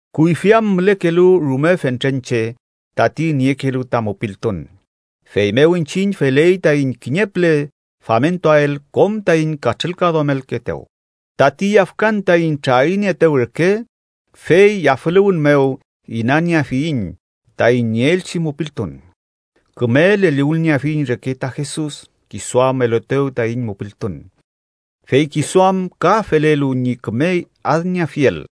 Kuyfi am mülekelu rume fentren che tati niekelu ta mupiltun, feymew iñchiñ feley taiñ kiñe püle famentuael kom taiñ katrülkaduamelkeetew, tati yafkan taiñ trarinieetew reke, fey yafüluwün mew inanieafiyiñ taiñ nieelchi mupiltun. Küme leliwülnieafiyiñ reke ta Jesus, kisu am eluetew taiñ mupiltun, fey kisu am ka felelu ñi küme adnieafiel.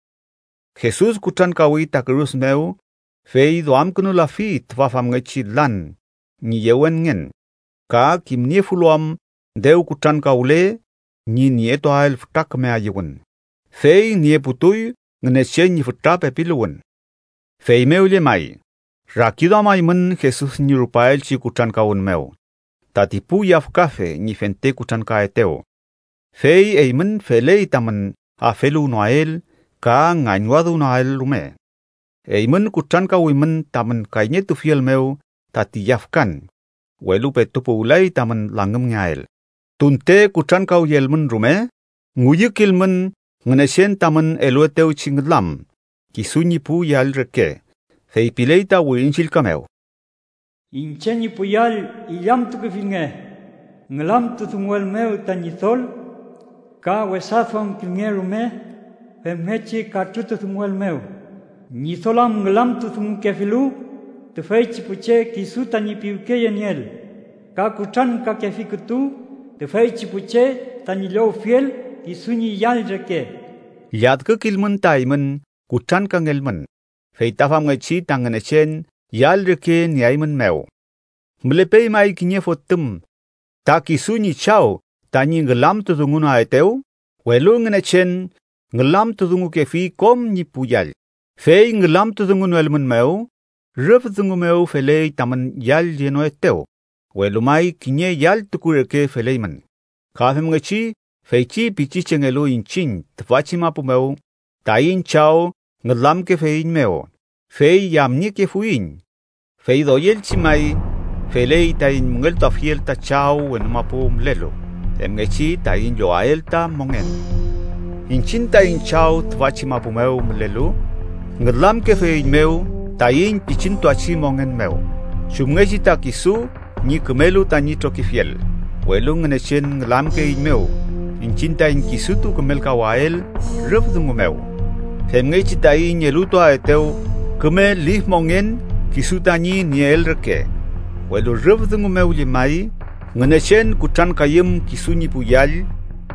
Jesus kutrankawi ta kürus mew, fey duamkünulafi tüfa famngechi lan ñi yewenngen, ka kimniefulu am dew kutrankawle ñi nietuael fütra küme ayüwün. Fey nieputuy Ngünechen ñi fütra pepiluwün. Feymew llemay, rakiduamaymün Jesus ñi rupaelchi kutrankawün mew tati pu yafkafe ñi fente kutrankaetew, fey eymün feley tamün afeluwnoael ka ngañwadüwnoael rume. Eymün kutrankawimün tamün kayñetufiel mew tati yafkan, welu petu puwlay tamün langümngeael. Tunte kutrankawyelmün rume, ngüyükilmün Ngünechen tamün eluetewchi ngülam kisu ñi pu yall reke. Feypiley ta Wirin Chillka mew: “Iñche ñi pu yall, illamtukefilnge ngülamtudunguelmew ta Ñidol ka wesaduamkilnge rume femngechi katrütudunguelmew. Ñidol am ngülamtudungukefilu tüfeychi pu che kisu tañi piwkeyenieel ka kutrankakefi kütu tüfeychi pu che tañi llowfiel kisu ñi yall reke.” Lladkükilmün ta eymün kutrankangelmün, fey ta famngechi ta Ngünechen yall reke nieaeymünmew. ¿Mülepey may kiñe fotüm ta kisu ñi chaw tañi ngülamtudungunoaetew? Welu Ngünechen ngülamtudungukefi kom ñi pu yall, fey ngülamtudungunoelmünmew, rüf dungu mew feley tamün yallyenoetew, welu may kiñe yalltuku reke feleymün. Ka femngechi, feychi pichichengelu iñchiñ tüfachi mapu mew, taiñ chaw ngülamkefeiñmew, fey yamniekefuiñ. Fey doyelchi may, feley taiñ müngeltuafiel ta Chaw wenu mapu mülelu, femngechi taiñ llowael ta mongen. Iñchiñ taiñ chaw tüfachi mapu mew mülelu, ngülamkefeiñmew taiñ pichintuachi mongen mew, chumngechi ta kisu ñi kümelu tañi trokifiel, welu Ngünechen ngülamkeeiñmew, iñchiñ taiñ kisutu kümelkawael rüf dungu mew, femngechi taiñ elutuaetew küme lif mongen kisu tañi nieel reke. Welu rüf dungu mew llemay, Ngünechen kutrankayüm kisu ñi pu yall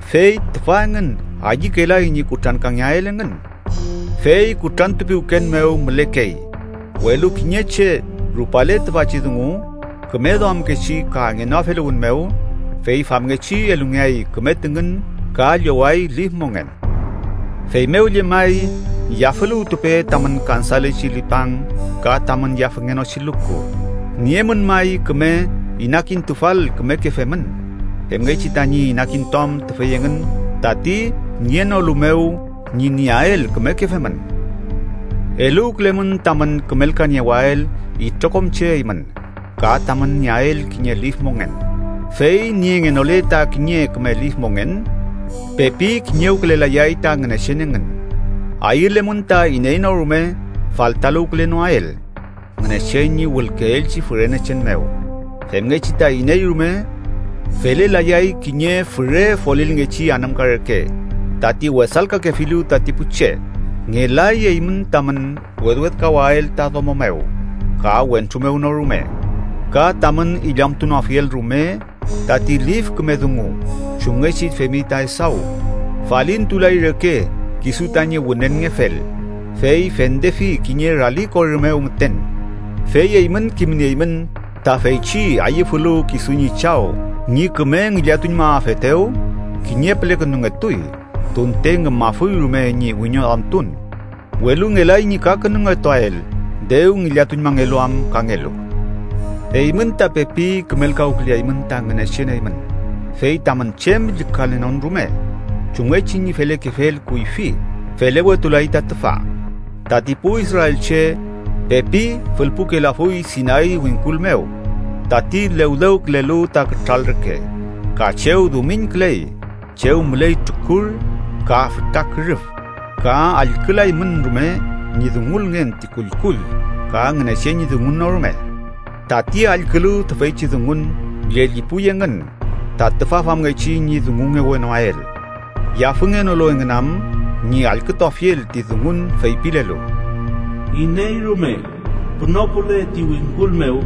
fey tüfa engün ayükelay ñi kutrankangeael engün fey kutrantupiwken mew mülekey. Welu kiñe che rupale tüfachi dungu küme duamkechi ka ngenoafeluwün mew, fey famngechi elungeay küme tüngün ka lloway lif mongen. Feymew llemay, yafüluwtupe tamün kansalechi lipang ka tamün yafüngenochi luku. Niemün may küme inakintufal kümeke femün, femngechi tañi inakintuam tüfey engün tati nienolu mew ñi nieael kümeke femün. Eluwkülemün tamün kümelkaniewael itrokom che eymün ka tamün nieael kiñe lif mongen. Fey niengenole ta kiñe küme lif mongen, pepi kiñewkülelayay ta Ngünechen engün. Ayülemün ta iney no rume faltaluwkülenoael Ngünechen ñi wülkeelchi fürenechen mew, femngechi ta iney rume felelayay kiñe füre folilngechi anümka reke, tati wesalkakefilu tati pu che. Ngelay eymün tamün wedwedkawael ta domo mew ka wentru mew no rume ka tamün illamtunoafiel rume tati lif küme dungu chumngechi femi ta Esaw. Falintulay reke kisu tañi wünenngefel, fey fendefi kiñe rali korü mew müten. Fey eymün kimnieymün ta feychi ayüfulu kisu ñi chaw ñi küme ngillatuñmaafetew, kiñe pülekünungetuy tunte ngümafuy rume ñi wiñoduamtun, welu ngelay ñi kakünungetuael dew ngillatuñmangelu am kangelu. Eymün ta pepi kümelkawküleaymün ta Ngünechen eymün, fey tamün chem llükalenon rume. Chumngechi ñi felekefel kuyfi, felewetulay ta tüfa. Tati pu israelche pepi fülpukelafuy Sinay wingkul mew tati lewlewkülelu ta kütral reke, ka chew dumiñküley, chew müley trukur ka fütra kürüf. Ka allkülaymün rume ñi dungulngen ti kullkull ka Ngünechen ñi dungun no rume. Tati allkülu tüfeychi dungun llellipuy engün ta tüfa famngechi ñi dungungewenoael, yafüngenolu engün am ñi allkütuafiel ti dungun feypilelu: “Iney rume pünopule ti wingkul mew,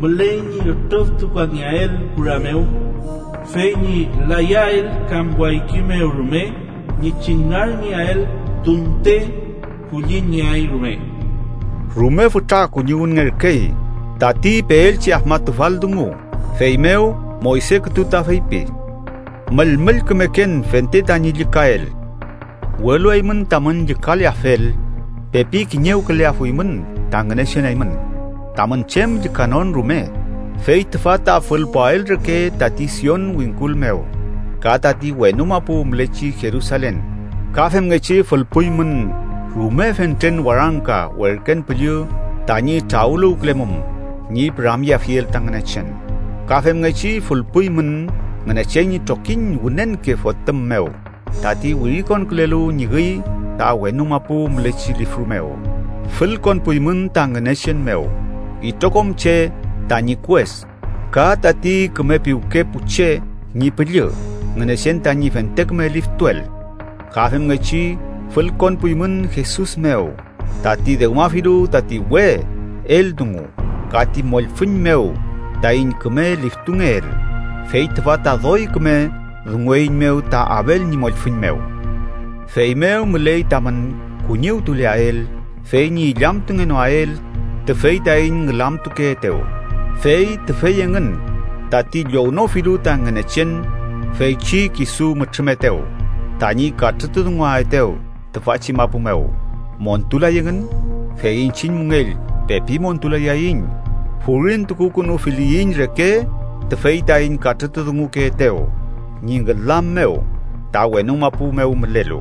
müley ñi ütrüftukangeael kura mew fey ñi layael kam wayki mew rume ñi chüngarngeael tunte kulliñngeay rume.” Rume fütra kuñiwünngerkey tati peelchi afmatufal dungu, feymew Moyse kütu ta feypi: “Müllmüllkümeken fente tañi llükael.” Welu eymün tamün llükaleafel, pepi kiñewküleafuymün ta Ngünechen eymün tamün chem llükanon rume fey tüfa ta fülpuael reke tati Sion wingkul mew, ka tati wenu mapu mülechi Jerusalen, ka femngechi fülpuymün rume fentren warangka werken püllü tañi trawüluwkülemum ñi püramyeafiel ta Ngünechen. Ka femngechi fülpuymün Ngünechen ñi trokiñ wünenke fotüm mew tati wirikonkülelu ñi üy ta wenu mapu mülechi lifru mew. Fülkonpuymün ta Ngünechen mew, itrokom che tañi kues, ka tati küme piwke pu che ñi püllü Ngünechen tañi fente küme liftuel. Ka femngechi fülkonpuymün Jesus mew, tati dewmafilu tati we eldungu, ka ti mollfüñ mew taiñ küme liftungeel, fey tüfa ta doy küme dungueiñmew ta Abel ñi mollfüñ mew. Feymew müley tamün kuñiwtuleael fey ñi illamtungenoael tüfey taiñ ngülamtukeetew. Fey tüfey engün tati llownofilu ta Ngünechen feychi kisu mütrümetew tañi katrütudunguaetew tüfachi mapu mew, montulay engün. Fey iñchiñ müngell pepi montulayaiñ, furintukukünufiliyiñ reke tüfey taiñ katrütudungukeetew ñi ngülam mew ta wenu mapu mew mülelu.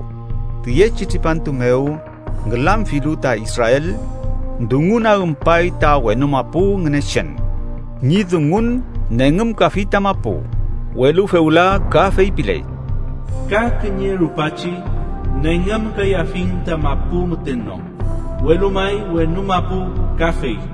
Tüyechi tripantu mew ngülamfilu ta Israel, dungunagümpay ta wenu mapu Ngünechen. Ñi dungun nengümkafi ta mapu, welu fewla ka feypiley: “ka kiñe rupachi nengümkayafiñ ta mapu müten no, welu may wenu mapu kafey.”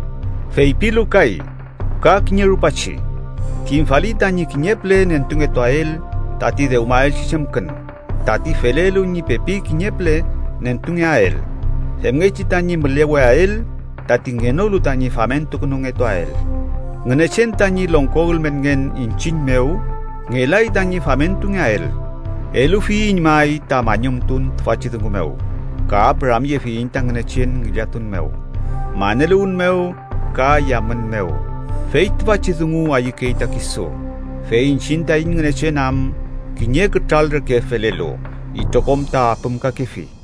Feypilu kay: “ka kiñe rupachi” kimfali tañi kiñe püle nentungetuael tati dewmaelchi chemkün, tati felelu ñi pepi kiñe püle nentungeael, femngechi tañi müleweael tati ngenolu tañi famentukünungetuael. Ngünechen tañi longko ülmenngen iñchiñ mew, ngelay tañi famentungeael. Elufiyiñ may ta mañumtun tüfachi dungu mew, ka püramyefiyiñ ta Ngünechen ngillatun mew, maneluwün mew ka yamün mew fey tüfachi dungu ayükey ta kisu. Fey iñchiñ taiñ Ngünechen am kiñe kütral reke felelu, itrokom ta apümkakefi.